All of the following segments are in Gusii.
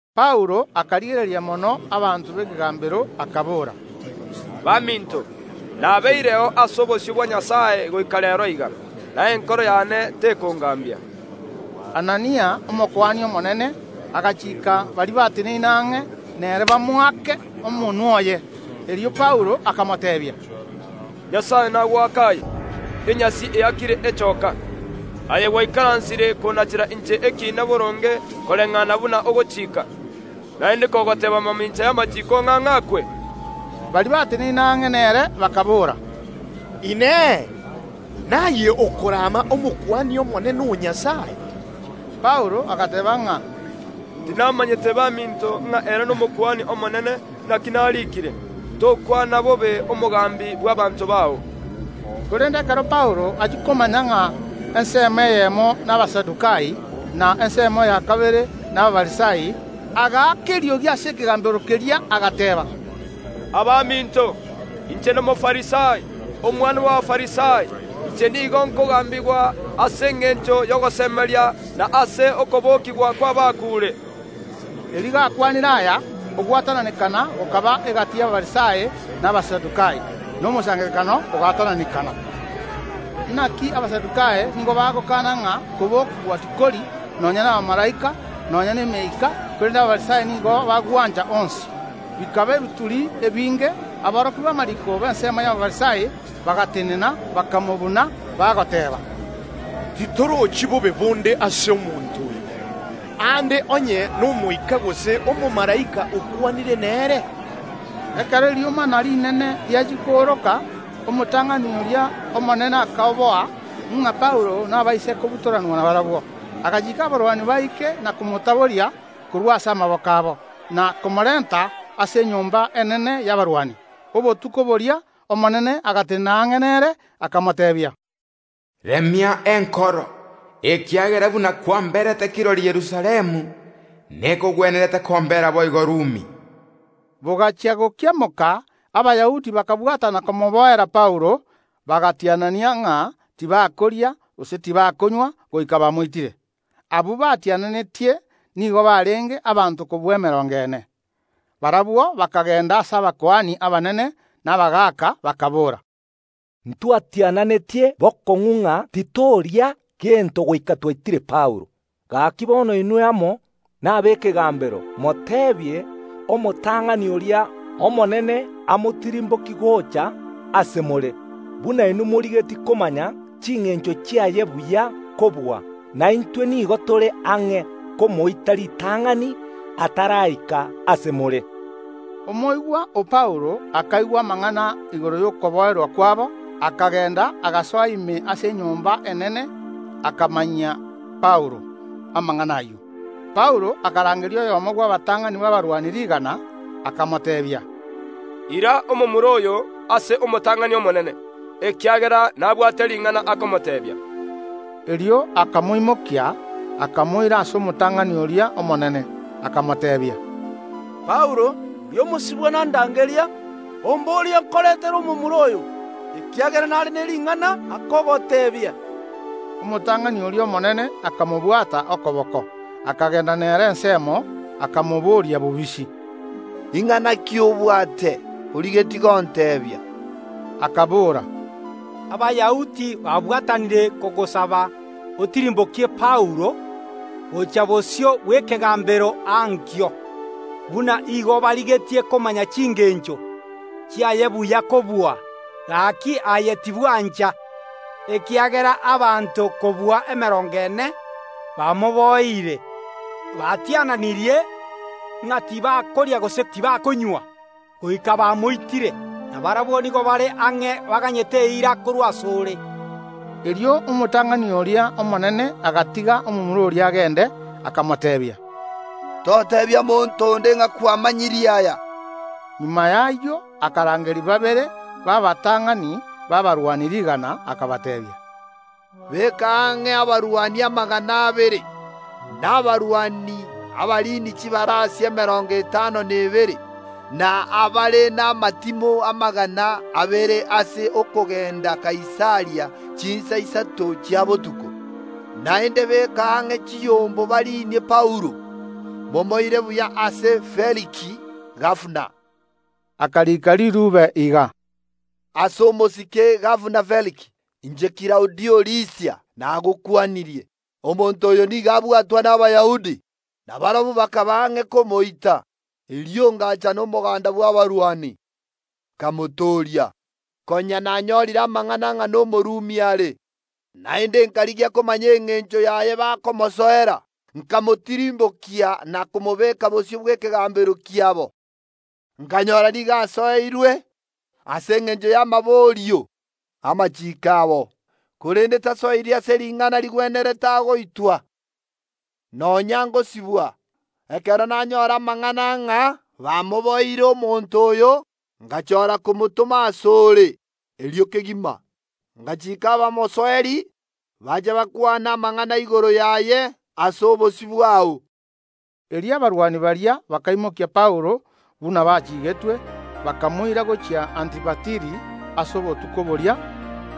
Paulo akarigereria mono abanto b’ekegambero, akabora: “Baminto, nabeireo ase obosio bwa Nyasae goika reero iga, na enkoro yane tekongambia.” Anania, Omokuani omonene, agachiika baria bateneine ang’e nere bamoake omonwa oye. Erio Paulo akamoteebia: “Nyasae nagoake aye, enyasi eakire echooka! Aye gwaikaransire konachera inche ekiina boronge koreng’ana buna ogochika, naende kogoteeba mamincha y’amachiiko ng’a ng’akwe?” Baria bateneine ang’e nere bakaboora: “Inee! Naye okorama Omokuani omonene o Nyasae?” Paulo agateeba ng’a: “Tinamanyete baminto ng’a ere n’Omokuani omonene, naki nariikire: Tokwana bobe omogambi bw’abaanto bao.” Korende ekero Paulo achia komanya ng’a ensemo eyemo n’Abasadukai, na ensemo ya kabere n’Abafarisai, agaaka eriogi ase ekegambero keria, agateeba: “Abaminto, inche n’Omofarisai, omwana bw’Abafarisai; inche nigo nkogambigwa ase engencho y’ogosemeria na ase okobokigwa kw’abakuure.” Erio gakwanire aya, ogwatananekana gokaba egati y’Abafarisai na Abasadukai, na omosangererekano ogaatananekana. Naki Abasadukai nigo bagokana ng’a kobokigwa tikori, nonya nabamalaika, nonya nemeika, korende Abafarisai nigo bagwancha onsi. Bikaba ebituri ebinge; aborokia b’amariiko b’ensemo y’Abafarisai bagatenena, bakamobuna, bagoteeba: “Titorochi bobe bonde ase omonto oyo. Aande onye n’Omoika gose omomalaika okwanire nere?” Ekero eriomana rinene riachia kooroka, omotang’ani oria omonene akoboa ng’a Paulo nabaise kobutoranwa nabarabwo, agachiika abarwani baike na komotaboria korwa ase amaboko abo, na komorenta ase enyomba enene y’abarwani. Obotuko bori’Omonene agatenena ang’e nere, akamoteebia: “Remia enkoro, ekiagera buna kwamberete kirori Yerusalemu, nekogwenerete kombera boigo Rumi.” Bogachia gokiamoka, Abayahudi bakabwatana komoboera Paulo, bagatianania ng’a tibakoria gose tibakonywa goika bamoitire. Abwo batiananetie nigo barenge abanto kobua emerongo ene. Barabwo bakagenda ase abakuani abanene na abagaaka, bakaboora: “Ntwatiananetie bokong’u ng’a titoria gento goika twaitire Paulo. Gaki bono inwe amo nab’ekegambero moteebie omotang’ani oria omonene amotirimbokie gocha ase more, buna inwe morigetie komanya chingencho chiaye buya kobua; na intwe nigo tore ang’e komoita ritang’ani ataraika ase more.” Omoigwa o Paulo akaigwa amang’ana igoro y’okoboera kwabo, akagenda, agasoa ime ase enyomba enene, akamanyia Paulo amang’ana ayio. Paulo akarangeria oyomo bw’abatang’ani b’abarwani rigana, akamoteebia: “Ira omomura oyo ase omotang’ani omonene, ekiagera nabwate ring’ana akomoteebia.” Erio akamoimokia, akamoira ase omotang’ani oria omonene, akamoteebia: “Paulo, oria omosibwa nandangeria, omboria nkorentere omomura oyo, ekiagera nare ne ring’ana akogoteebia.” Omotang’ani oria omonene akamobwata okoboko, akagenda nere ensemo, akamobooria bobisi: “Ing’ana ki obwate origetie gonteebia?” Akabora: “Abayahudi babwatanire kogosaba otirimbokie Paulo gochia bosio bw’ekegambero ankio, buna igo barigetie komanya chingencho chiaye buya kobua. Gaki aye tibwancha, ekiagera abanto kobua emerongo ene bamoboeire, batiananirie ng’a tibakoria gose tibakonywa goika bamoitire; na barabwo nigo bare ang’e baganyete eira korwa ase ore.” Erio omotang’ani oria omonene agatiga omomura oria agende, akamoteebia: “Toteebia monto onde ng’a kwamanyirie aya.” Magega y’ayio akarangeria babere b’abatang’ani b’abarwani rigana, akabateebia: “Beka ang’e abarwani amagana abere, na abarwani abariini chibarasi emerongo etano na ebere, na abare namatimo amagana abere ase okogenda Kaisaria chinsa isato chia botuko. Naende beka ang’e chibarasi bariinie Paulo, momoire buya ase Feliki, gabana.” Akarika riruube iga: “Ase omosike gabana Feliki. Inche Klaudio Lisia, nagokwanirie. Omonto oyo nigo abwatwa n’Abayahudi, na barabwo bakaba ang’e komoita. Erio ngacha nomoganda bw’abarwani, nkamotooria, konya nanyorire amang’ana ng’a n’Omorumi are. Naende nkarigia komanya engencho yaye bakomosoera, nkamotirimbokia na komobeka bosio bw’ekegambero kiabo. Nkanyora ng’a nigo asoeirwe ase engencho y’amaborio ’amachiiko abo, korende tasoeiri ase ring’ana rigwenerete agoitwa nonya ngosibwa. Ekero nanyora amang’ana ng’a Abayahudi bamoboereire omonto oyo, ngachora komotoma ase ore erio kegima, ngachiika abamosoeri bache bakwane amang’ana igoro yaye ase obosio bwao.” Erio abarwani baria bakaimokia Paulo buna bachiigetwe, bakamoira gochia Antipatiri ase obotuko boria.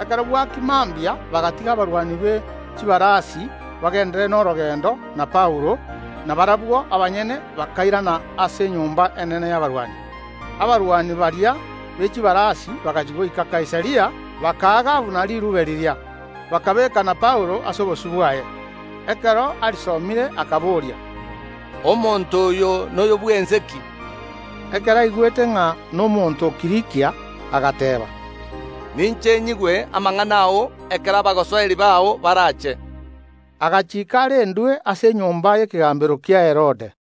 Ekero bwakia mambia bagatiga abarwani be chibarasi bagenderere norogendo na Paulo, na barabwo abanyene bakairana ase enyomba enene y’abarwani. Abarwani baria be chibarasi bagachia goika Kaisaria, bakaa gabana riruube riria, bakabeeka na Paulo ase obosio bwaye. Ekero arisomire, akaboria: “Omonto oyo noyo bw’ense ki?” Ekero aigwete ng’a nomonto o Kilikia, agateeba, “Ninche nyigwe amang’ana ao ekero abagosoeri bao barache.” Agachiika arendwe ase enyomba y’ekegambero kia Herode.